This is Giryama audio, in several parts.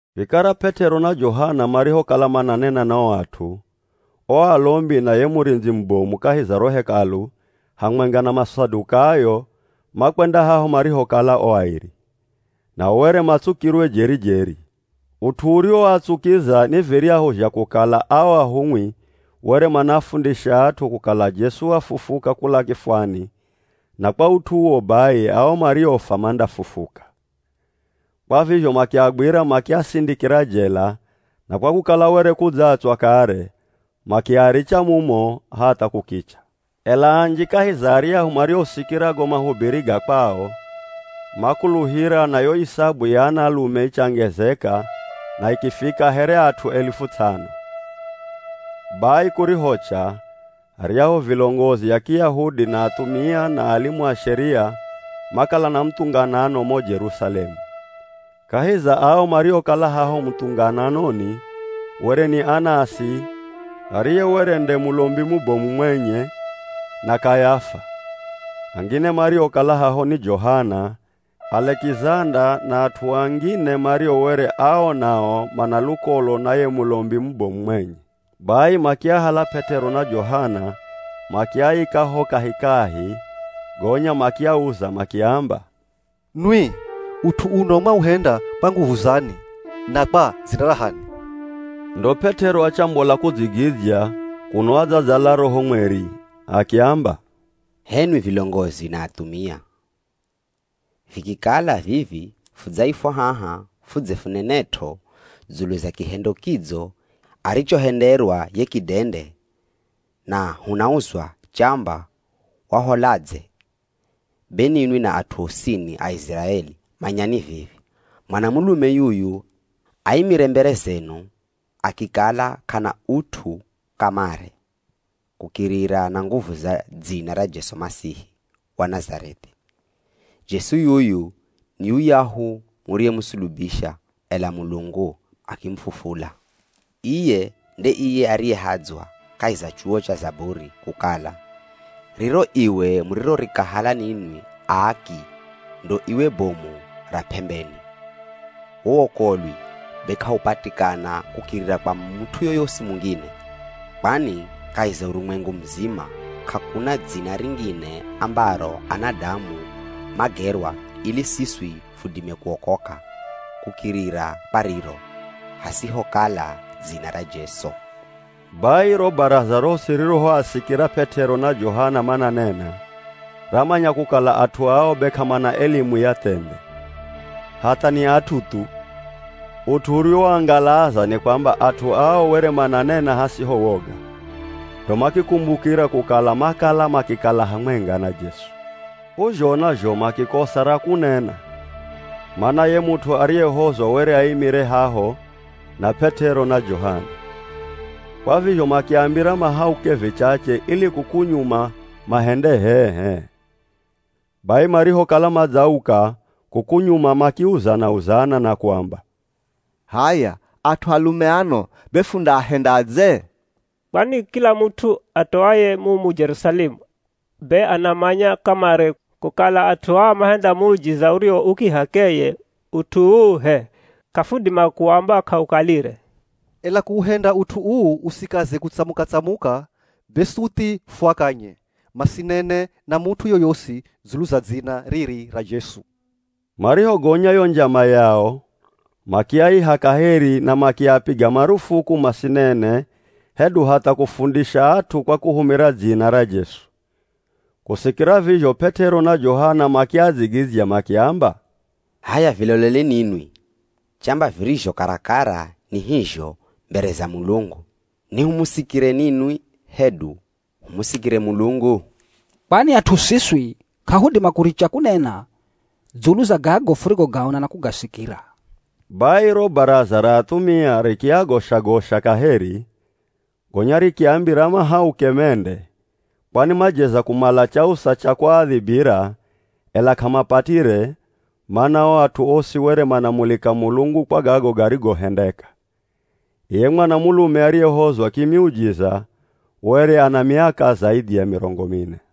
Vikara P'et'ero na Johana marihokala mananena na o at'u, o alombi na ye murindzi mubomu kahi za ro Hekalu hamwenga na Masadukayo makwenda haho marihokala o airi. Nao were matsukirwe jeri-jeri. Ut'u uriwoatsukiza ni viryahu zha kukala ao ahumwi were manaafundisha at'u kukala Jesu wafufuka kula kifwani na kwa ut'u uwo bai ao mariofwa mandafufuka. Kwa vizho makiagwira makiasindikira jela, na kwa kukala were kudzatswa kare, makiaricha mumo hatha kukicha. Ela anji kahi za aryahu mariosikira go mahubiri ga kwao, makuluhira na yo isabu ya anaalume ichangezeka na ikifika here at'u alifu ts'ano. Bai kurihocha, aryahu vilongozi a Kiyahudi, na athumia na alimu a Sheria makala na muthunganano mo Jerusalemu. Kahi za ao mariokala haho muthungananoni, were ni Anasi ariye were nde Mulombi mubomu mwenye na Kayafa. Angine mariokala haho ni Johana, Alekizanda na at'u angine mario were ao nao mana lukolo na ye Mulombi mubomu mwenye. Bai makiahala P'et'ero na Johana makiaika ho kahikahi, gonya makiauza makiamba, “Nwi, ut'u uno mwauhenda kwa nguvu zani na kwa dzina ra h'ani?” Ndo P'et'ero achambola kudzigidzya kuno adzadzala Roho Mweri, akiamba, “H'enwi vilongozi na athumia! Vikikala vivi fudzaifwa haha fudze funenet'o dzulu za kihendo kidzo arichohenderwa ye kidende na hunauzwa chamba waholadze, be ninwi na at'u osini a Iziraeli, manyani vivi: Mwanamulume yuyu aimire mbere zenu akikala k'ana ut'u kamare kukirira na nguvu za dzina ra Jesu Masihi wa Nazareth'i. Jesu yuyu ni yuyahu muriyemusulubisha, ela Mulungu akimufufula. Iye nde iye ariyehadzwa kahi za chuwo cha Zaburi, kukala, ‘Riro iwe murirorikahala ninwi aaki, ndo iwe bomu ra p'embeni.’ Wo wokolwi be k'aupatikana kukirira kwa mut'u yoyosi mungine, kwani kahi za urumwengu muzima k'akuna dzina ringine ambaro anadamu magerwa ili siswi fudime kuokoka kukirira kwa riro, hasihokala dzina ra Jesu.” Bai ro Baraza rosi ririhoasikira P'et'ero na Johana mananena, ramanya kukala at'u ao be k'amana elimu ya thendhe, hatha ni at'u thu. Ut'u uriwoangalaza ni kwamba at'u ao were mananena hasiho woga, ndo makikumbukira kukala makala makikala hamwenga na Jesu. K'uzhona zho makikosa ra kunena, mana ye mut'u ariyehozwa were aimire haho na P'et'ero na Johana. Kwa vizho makiambira mahauke vichache, ili kuku nyuma mahende h'ee-h'ee. Bai marihokala madzauka kuku nyuma makiuzana-uzana na kuamba, “H'aya, at'u alume ano be fundaahendadze? Kwani kila mut'u atoaye mumu Jerusalemu, be anamanya kamare kukala at'u aa mahenda muujiza uriwo u kih'akeye, ut'u uu h'e, k'afudima kuamba k'aukalire. Ela kuuhenda ut'u uu usikaze kutsamuka-tsamuka, be suthi fuakanye, masinene na mut'u yoyosi dzulu za dzina riri ra Jesu.” Marihogonya yo njama yao makiaiha kaheri na makiapiga marufuku masinene hedu hatha kufundisha at'u kwa kuhumira dzina ra Jesu. Kusikira vizho P'et'ero na Johana makiadzigidzya makiamba, “H'aya viloleni ninwi chamba virizho karakara ni hizho mbere za Mulungu, ni humusikire ninwi hedu humusikire Mulungu? Kwani at'u siswi k'ahudima kuricha kunena dzulu za gago furigogaona na kugasikira.” Bai ro Baraza ra athumia rikiagosha-gosha kaheri, gonya rikiambira mahauke mende, kwani majeza kumala chausa cha kuaadhibira, ela k'amapatire, mana o at'u osi were manamulika Mulungu kwa gago garigohendeka. Iye mwanamulume ariyehozwa kimiujiza were ana miaka zaidhi ya mirongo mine.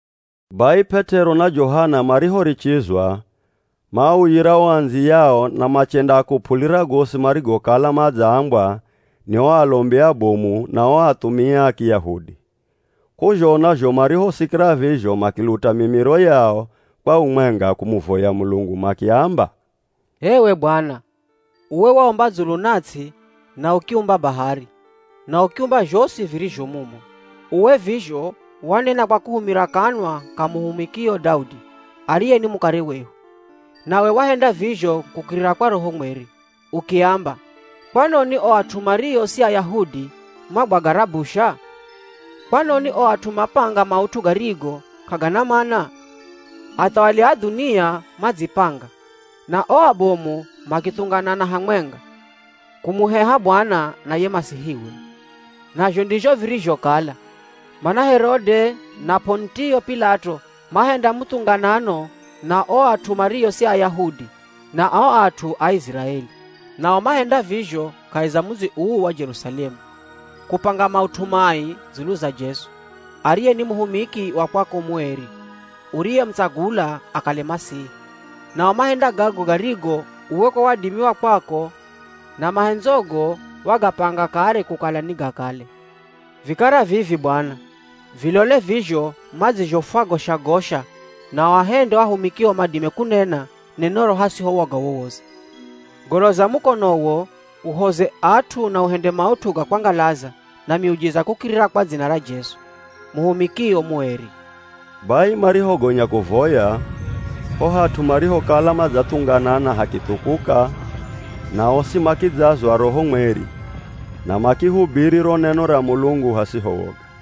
Bai P'et'ero na Johana marihorichizwa, maauyira o andziyao na machendaakup'ulira gosi marigokala madzaambwa ni o alombi abomu na o athumia a Kiyahudi. K'uzhona zho marihosikira vizho makiluta mimiro yao kwa umwenga kumuvoya Mulungu, makiamba, “H'ewe Bwana, uwe waumba dzulu na ts'i na ukiumba bahari, na ukiumba zhosi virizho mumo. Uwe vizho wanena kwa kuhumira kanwa ka muhumikio Daudi, ariye ni mukare wehu. Nawe wahenda vizho kukirira kwa Roho Mweri, ukiamba, ‘Kwanoni o at'u mario si Ayahudi magwaga rabusha? Kwanoni o at'u mapanga maut'u garigo k'agana mana? Athawali a dhunia madzipanga, na o abomu makithunganana hamwenga, kumuheha Bwana na ye Masihiwe.’ “Nazho ndizho virizhokala, mana Herode na P'onitio P'ilato mahenda muthunganano na o at'u mario si Ayahudi na o at'u a Iziraeli. Nao mahenda vizho kahi za mudzi uu wa Jerusalemu, kupanga maut'u mai dzulu za Jesu, ariye ni muhumiki wa kwako mueri, uriyemutsagula akale Masihi. Nao mahenda gago garigo uwe kwa wadimi wa kwako na mahendzogo wagapanga kare kukala nigakale. Vikara vivi Bwana, vilole vizho madzizhofwagosha-gosha na uahende o ahumikio madime kunena nenoro hasiho woga wowosi. Goloza mukonowo uhoze at'u na uhende maut'u ga kwangalaza na miujiza kukirira kwa dzina ra Jesu, muhumikio mueri.” Bai marihogonya kuvoya, ho hat'u marihokala madzathunganana hakithukuka na osi makidzazwa Roho Mweri, na makihubiri ro neno ra Mulungu hasiho woga.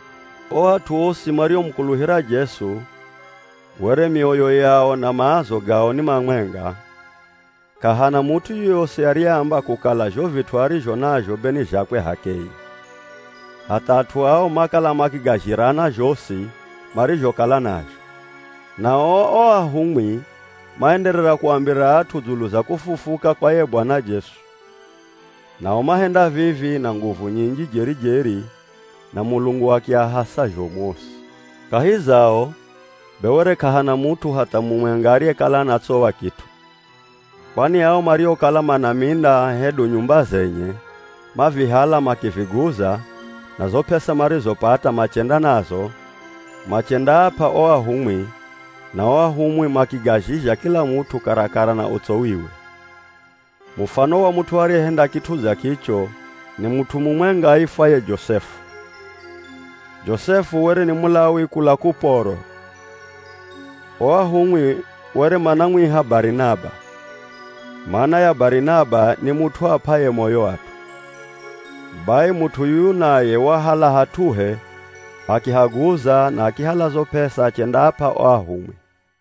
O at'u osi mariomukuluhira Jesu were mioyo yao na maazo gao ni mamwenga. K'ahana mut'u yoyosi ariyeamba kukala zho vit'u arizho nazho be ni zhakwe h'akeye. Hatha, at'u ao makala makigazhirana zhosi marizhokala nazho. Nao o ahumwi maenderera kuambira at'u dzulu za kufufuka kwa ye Bwana Jesu. Nao mahenda vivi na nguvu nyinji jeri-jeri na Mulungu akiahasa zhomu osi. Kahi zao, be were k'ahana mut'u hatha mumwenga ariyekala anatsowa kit'u, kwani ao mariokala mana minda hedu nyumba zenye, mavihala makiviguza na zo p'esa marizopata machenda nazo, machendaap'a o ahumwi, na o ahumwi makigazhizha kila mut'u karakara na utsowiwe. Mufano wa mut'u ariyehenda kit'u dza kicho, ni mut'u mumwenga aifwaye Josefu. Josefu were ni Mulawi kula Kuporo. O ahumwi were manamwiha Barinaba (mana ya Barinaba ni mut'u ap'aye moyo at'u). Bai mut'u yuyu naye wahala hat'uhe akihaguza na akihala zo p'esa achendaap'a o ahumwi.